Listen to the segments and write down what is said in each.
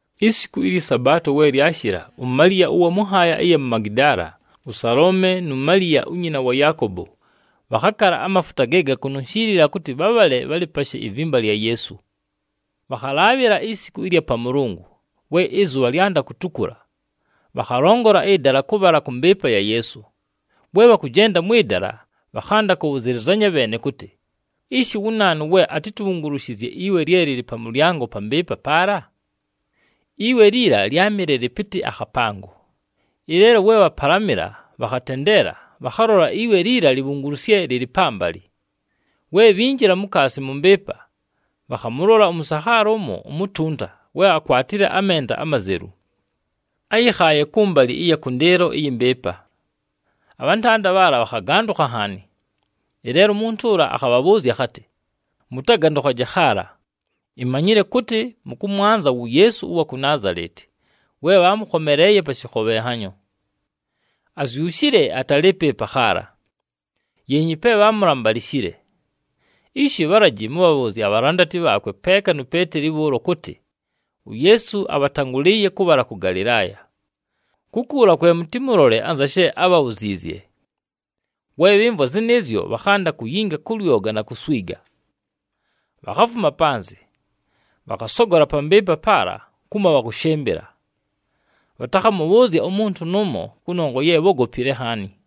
Isiku ɨlyɨ Sabaato we lyashɨla, uMaliya ʉwa mʉ nhaaya ɨya mu Magidaala, ʉSaloome nu Maliya unyina wa Yaakobo, bhakhakala amafuta ge gakununshiilila kʉtɨ bhabhale bhalɨpashe ivimba lya Yeesu. Bhakhalaabhɨla isiku ɨlya Pamʉlʉngʉ, we ɨzʉbha lyanda kutukula, bhakhalongola ɨdala kʉbhala kʉ mbɨɨpa ya Yeesu. We bhakʉjenda mwɨ dala, bhakhanda kʉbhʉzɨlɨzanya bheene kʉtɨ, “Ishi wu naanu we atitubhungulushizye iwe lye lɨlɨ pa mʉlyango pa mbɨɨpa paala?” Iwe liila lyámɨle lɨpɨtɨ akhapango. Ɨleelo we bhapalamɨla, bhakhatendeela, bhakhalola iwe liila libhungulusye, lɨlɨ pambalɨ. We bhinjila mukaasi mʉ mbɨɨpa, bhakhamʉlola ʉmʉsakhaala ʉmo umutunta we akwatile amenda amazelu. Áyɨkhaaye kʉmbalɨ ɨya kʉndɨɨlo ɨyɨ mbɨɨpa, abhantanda bhaala bhakhagandʉkha nhaani. Ɨleelo umuntu ʉla akhabhabhʉʉzya akhatɨ, “Mʉtagandʉkhaje khaala. Imanyile kʉtɨ mʉkʉmwanza wu Yeesu ʉwa ku Naazaleti we bhaamʉkhomeleeye pa shɨkhobhenhanyo. Azyushile, atalɨɨpo ɨpa khaala! Yeenyi pe bhaamulambalishile. Ishi bhalaji mʉbhabhʉʉzye abhalandati bhaakwe peeka nu Peeteli bhʉʉlo kʉtɨ, uYeesu abhatangʉlɨɨye kʉbhala kʉ Galɨlaaya. Kukuula kwe mʉtɨmʉlole anza she ábhabhuziizye.” We bhɨmvwa zɨnɨɨzyo, bhakhanda kuyinga kʉ lyoga na kuswiga. Bhakhafuma panzɨ, bhakhasogola pa mbɨɨpa paala kumo bhakʉshɨmbɨla. Bhatakhamʉbhʉʉzya umuntu nʉʉmo kʉnongwa ye bhógopile nhaani. [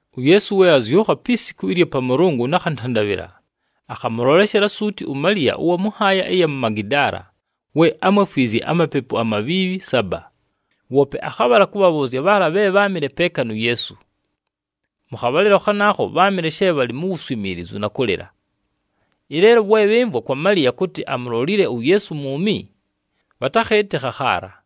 UYeesu we azyʉkha pi siku ɨlya Pamʉlʉngʉ nakhantandabhɨla, akhamʉloleshela suuti uMaliya ʉwa mʉ nhaaya ɨya mu Magidaala we ámwefwizye amapepu amabhiibhi saba. Woope akhabhala kʉbhabhʉʉzya bhaala bhe bháamɨle peeka nu Yeesu. Mʉ khabhalɨlo khanaakho bháamɨle she bhalɨ mu wuswimiilizu na kʉlɨla. Ɨleelo we bhɨmvwa kwa Maliya kʉtɨ amulolile uYeesu mwumi, bhatakhɨɨtɨkha khaala.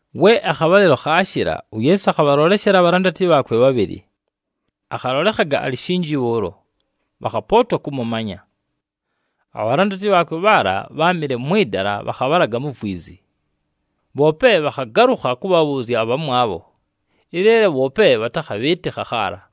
We akhabhalɨlo khaashɨla, uYeesu akhabhaloleshela abhalandati bhaakwe bhabhɨlɨ. Akhalolekhaga alɨ shinji bhʉʉlo, bhakhapootwa kʉmʉmanya. Abhalandati bhaakwe bhaala bháamɨle mwɨ dala, bhakhabhalaga mu vwizi. Bhoope bhakhagalʉkha kʉbhabhʉʉzya abhamwabho, ɨleelo bhoope bhatakhabhɨɨtɨkha khaala.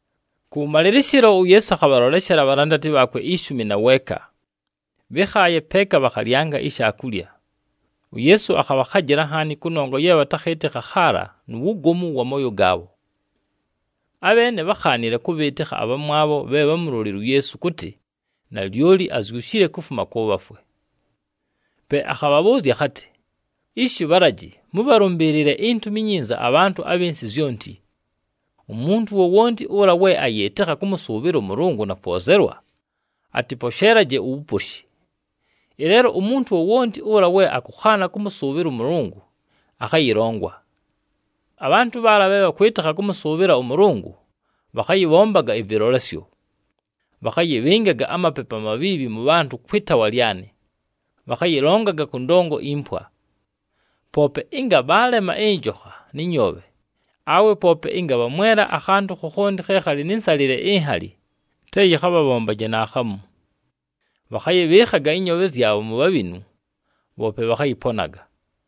Kʉwʉmalɨlɨshɨlo, uYeesu akhabhaloleshela abhalandati bhaakwe ishumi na weeka. Bhɨ́khaaye peeka bhakhalyanga ishaakulya. UYeesu akhabhakhajɨla nhaani kʉnongwa ye bhatakhɨɨtɨkha khaala nu wugomu wa mooyo gaabho. Abheene bhákhaanile kʉbhɨɨtɨkha abhamwabho bhe bhámulolile uYeesu kʉtɨ, nalyoli azyushile kufuma kʉ bhafwe. Pe akhabhabhʉʉzya akhatɨ, “Ishi bhalaji mʉbhalʉmbɨɨlɨle iNtumi iNyinza abhantʉ abhɨ nsɨ zyonti. Umuntu wowonti ʉla we ayɨɨtɨkha kʉmʉsʉʉbhɨla ʉMʉlʉngʉ na kwozelwa, atɨposheelaje uwuposhi. Ɨleelo umuntu wowonti ʉla we akʉkhaana kʉmʉsʉʉbhɨla ʉMʉlʉngʉ, akhayɨlongwa. Abhantʉ bhaala bhe bhakwɨtɨkha kʉmʉsʉʉbhɨla ʉMʉlʉngʉ, bhakhayɨbhombaga ɨvɨlolesyo. Bhakhayɨbhɨngaga amapepu amabhiibhi mʉ bhantʉ kwɨ taawa lyanɨ, bhakhayɨlongaga kʉ ndongo impwa. Poope ɨnga bhaalema ɨnjokha nɨ nyoobhe, awe poope ɨnga bhamwela akhantʉ khokhonti khe khalɨ nɨ nsalɨle inhali, te yɨkhabhabhombaje naakhamu. Bhakhayɨbhɨɨkhaga ɨnyoobhe zyabho mu bhabhinu, bhoope bhakhayɨponaga.”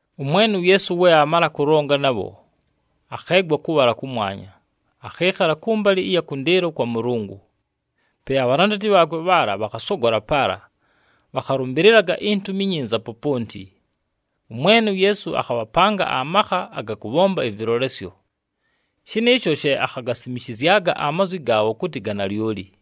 ɄMwene uYeesu we aamala kʉlonga nabho, akheegwa kʉbhala kʉmwanya. Akhɨɨkhala kʉmbalɨ ɨya kʉndɨɨlo kwa Mʉlʉngʉ. Pe abhalandati bhaakwe bhaala, bhakhasogola paala, bhakhalʉmbɨlɨlaga iNtumi iNyinza poponti. ɄMwene uYeesu akhabhapanga amakha aga kʉbhomba ɨvɨlolesyo. Shɨnɨɨsho she akhagasimishizyaga amazwi gaabho kʉtɨ ga nalyoli.]